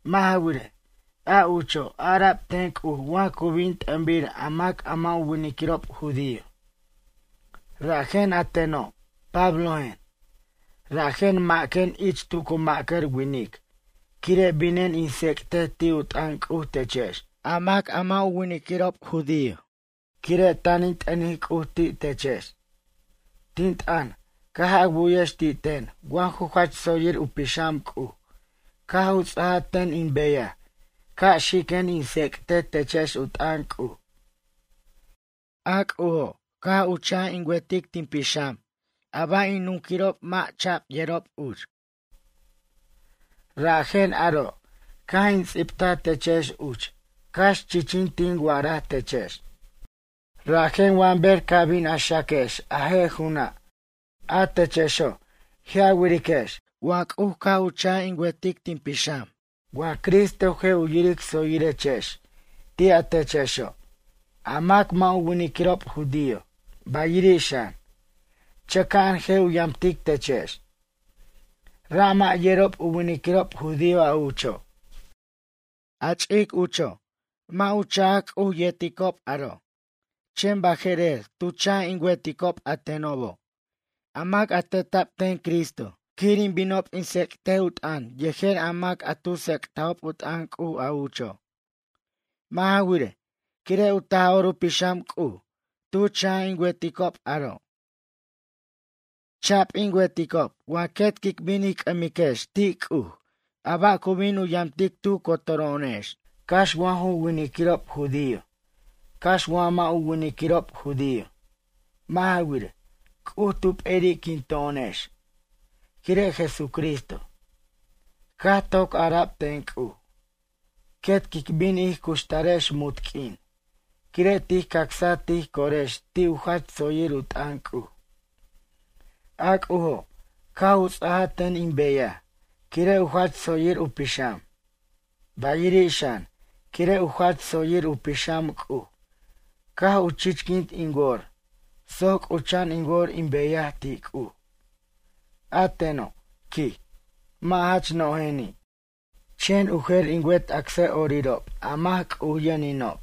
Mʌ' ja wirej, a ucho' ara'b ten C'uj wa cu bin t'ʌnbir a mac a mʌ' u winiquirob judío. Rajen a teno', Pablojen, rajen maquen ich tu cu ma'cʌr winic quire' binen in tsec'tej ti' u t'ʌn C'uj techex, a mac a mʌ' u winiquirob judío. Quire' tan in t'ʌnic C'uj ti' techex. Tin t'ʌn, caj a wu'yex ti' ten wa ju jach tsoyir u pixam C'uj caj u ts'aja ten in beyaj ca' xiquen in tsec'tej techex u t'ʌn C'uj. A C'ujo', caj u cha' in wer tin pixam a ba' in nunquirob mʌ' cha'b yerob uch. Rajen aro' caj in ts'ibtaj techex uch cax chichin tin wa'araj techex. Rajen wa ber ca' bin a xaquex a je' ju'una', a techexo' je' a wiriquex wa C'uj caj u cha' in wertic tin pixam wa Cristo je' yiric tsoyirechex ti' a techexo', a mac mʌ' u winiquirob judío, bayiri' xan, chʌca'an je' u yamtic techex. Ra' mʌ' yero' u winiquirob judío a ucho'. A ch'ic ucho', mʌ' u cha'b C'uj yerticob aro', chen baje'rer, tu cha' in werob, a tenob, a mac teta'b ten Cristo quir in binob in tsec'ticob u t'ʌn yejer a mac a tu tsec'tajob u t'ʌn C'uj a ucho'. Mʌ' ja wirej, quire' u Taj'or u Pixam C'uj tu cha' in werob aro'. Cha'b in werob wa quet quic bin ij c'ʌmiquex ti' C'uj a ba' cu bin u yamtic tu cotoro'onex, cax wa ju winiquirob judío cax wa mʌ' u winiquirob judío. Mʌ' ja wirej, C'uj tu p'eri'quinto'onex quire' Jesucristo. Caj toc ara'b ten C'uj, quet quic bin ij cuxtarex munt q'uin, quire' tij cacsaj tij corex ti' u jach tsoyir u t'ʌn C'uj. A C'ujo' caj u ts'ajaj ten in beyaj quire' u jach tsoyir u pixam. Bayiri' xan, quire' u jach tsoyir u pixam C'uj caj u chichquint in wor soc c'ucha'an in wor in beyaj ti' C'uj. A teno', quij, mʌ' jach nojeni', chen u jer in wet acsʌ'orirob a mac C'uj yʌninob,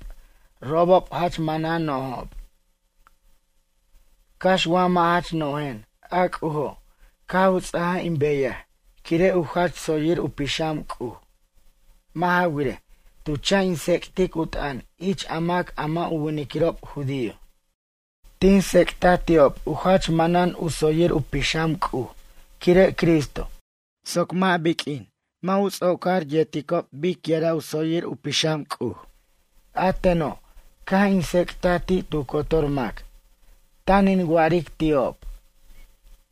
robob jach manan nojob. Cax wa mʌ' jach nojen a C'ujo' caj u ts'aja in beyaj quire' u jach tsoyir u pixam C'uj, mʌ' ja wirej, tu cha' in tsec'tic u t'ʌn ich a mac a mʌ' u winiquirob judío. Tin tsec'taj ti'ob u jach manan u tsoyir u pixam C'uj quire' Cristo, soc mʌ' biq'uin mʌ' u ts'ocor yerob biquira' u tsoyir u pixam C'uj. A teno' caj in tsec'taj ti' tu cotor mac, tan in wa'aric ti'ob,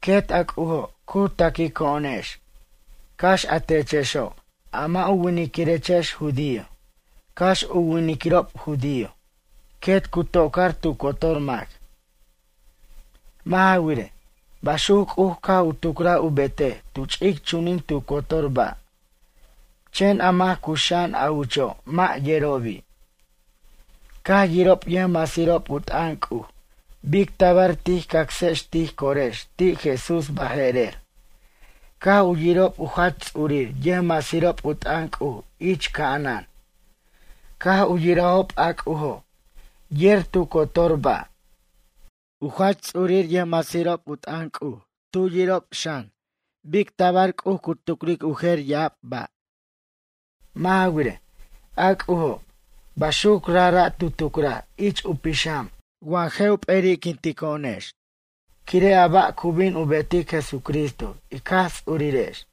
quet a C'ujo' cu taquico'onex, cax a techexo' a mʌ' u winiquirechex judío, cax u winiquirob judío, quet cu tocar tu cotor mac. Mʌ' ja wirej, baxuc C'uj caj u tucraj u betej tu ch'ic chunin tu cotor ba', chen a mac cuxa'an a ucho' mʌ' yerobi'. Caj yirob yʌjmasirob u t'ʌn C'uj bic tabar tij cacsex tij corex ti' Jesús baje'rer, caj u yirob u jach ts'urir yʌjmasirob u t'ʌn C'uj ich ca'anan, caj u yirajob a C'ujo' yer tu cotor ba'. U jach ts'urir yʌjmasirob u t'ʌn C'uj tu yirob xan bic tabar C'uj cu tucric u jer ya'ab ba'. Mʌ' ja wirej, a C'ujo' baxuco' rajra' tu tucraj ich u pixam wa je' u p'eri'quintajo'onex quire' a ba' cu bin u betic Jesucristo ic Jaj Ts'urirex.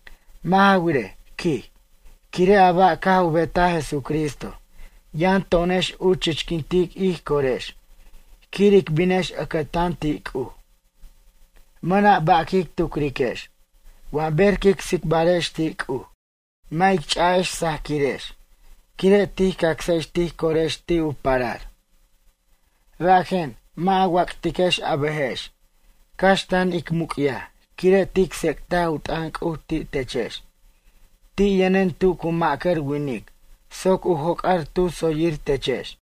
Mʌ' ja wirej, quij, quire' a ba' caj u betaj Jesucristo yʌn to'onex u chichquintic ij corex quir ic binex ʌcʌtan ti' C'uj. Mʌna' ba' quic tucriquex, wa ber quic tsicbarex ti' C'uj, mʌ' ic ch'a'ex sajaquirex, quire' tij cacsex tij corex ti' u parar. Rajen, mʌ' a wac'tiquex a bʌjex, cax tan in muc'yaj quire' tin tsec'taj u t'ʌn C'uj ti' techex. Ti' yʌnen tu cu ma'cʌr winic soc u joc'ar tu tsoyir techex.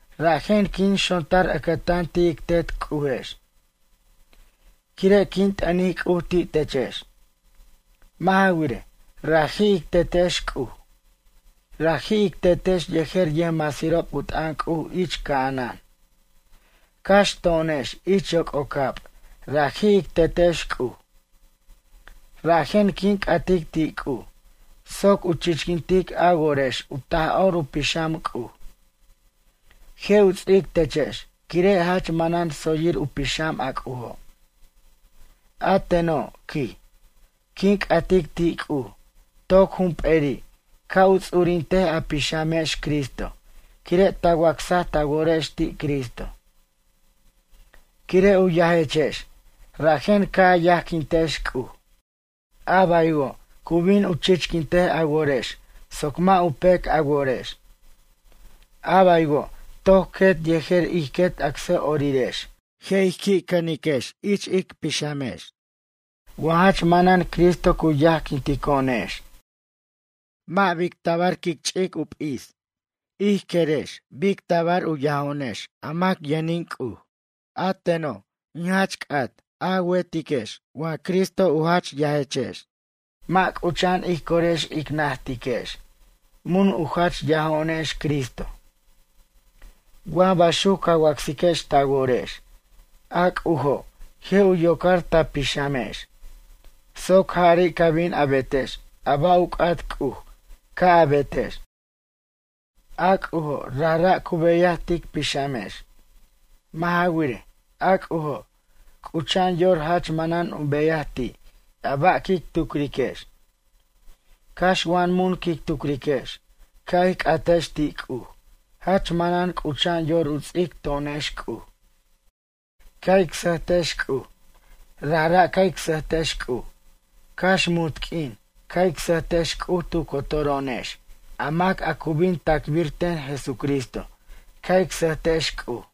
Rajen quin xontar ʌcʌtan ti' ic Tet C'ujex. Quire' quin t'ʌnic C'uj ti' techex. Mʌ' ja wirej, raji' ic Tetex, C'uj, raji' ic Tetex yejer yʌjmasirob u t'ʌn C'uj ich ca'anan, cax to'onex ich yoc'ocab raji' ic Tetex C'uj. Rajen quin c'atic ti' C'uj, soc u chichquintic a worex u Taj'or u Pixam C'uj. Je' u ts'ic techex quire' jach manan tsoyir u pixam a C'ujo'. A teno', quij, quin c'atic ti' C'uj toc jump'eri' ca' u ts'urintej a pixamex Cristo quire' ta wacsaj ta worex ti' Cristo. Quire' u yajechex rajen ca' a yajquintex C'uj. A baywo', cu bin u chichquintej a worex soc mʌ' u pec a worex. A baywo' toc quet yejer ij quet acsʌ'orirex je' ij qui' cʌniquex ich ic pixamex wa jach manan Cristo cu yajquintico'onex. Mʌ' bic tabar quic ch'ic u p'is ij querex bic tabar u yajo'onex, a mac yʌnin C'uj. A teno' in jach c'at a werex wa Cristo u jach yajechex, mʌ' c'ucha'an ij corex ic najtiquex mun u jach yajo'onex Cristo. Wa baxuc ca wacsiquex ta worex, a C'ujo' je' u yocar ta pixamex soc jari' ca bin a betex a ba' u c'at C'uj ca' a betex. A C'ujo' rajra' cu beyaj tic pixamex. Mʌ' ja wirej, a C'ujo' c'ucha'an yor jach manan u beyaj ti' a ba' quic tucriquex. Cax wa mun quic tucriquex ca' ij c'atex ti' C'uj jach manan c'ucha'an yor u ts'ic to'onex C'uj. Ca' ic sʌjtex C'uj, rajra' ca' ic sʌjtex C'uj, cax munt q'uin ca' ic sʌjtex C'uj tu cotoro'onex a mac a cu bin tacbir ten Jesucristo ca' ic sʌjtex C'uj.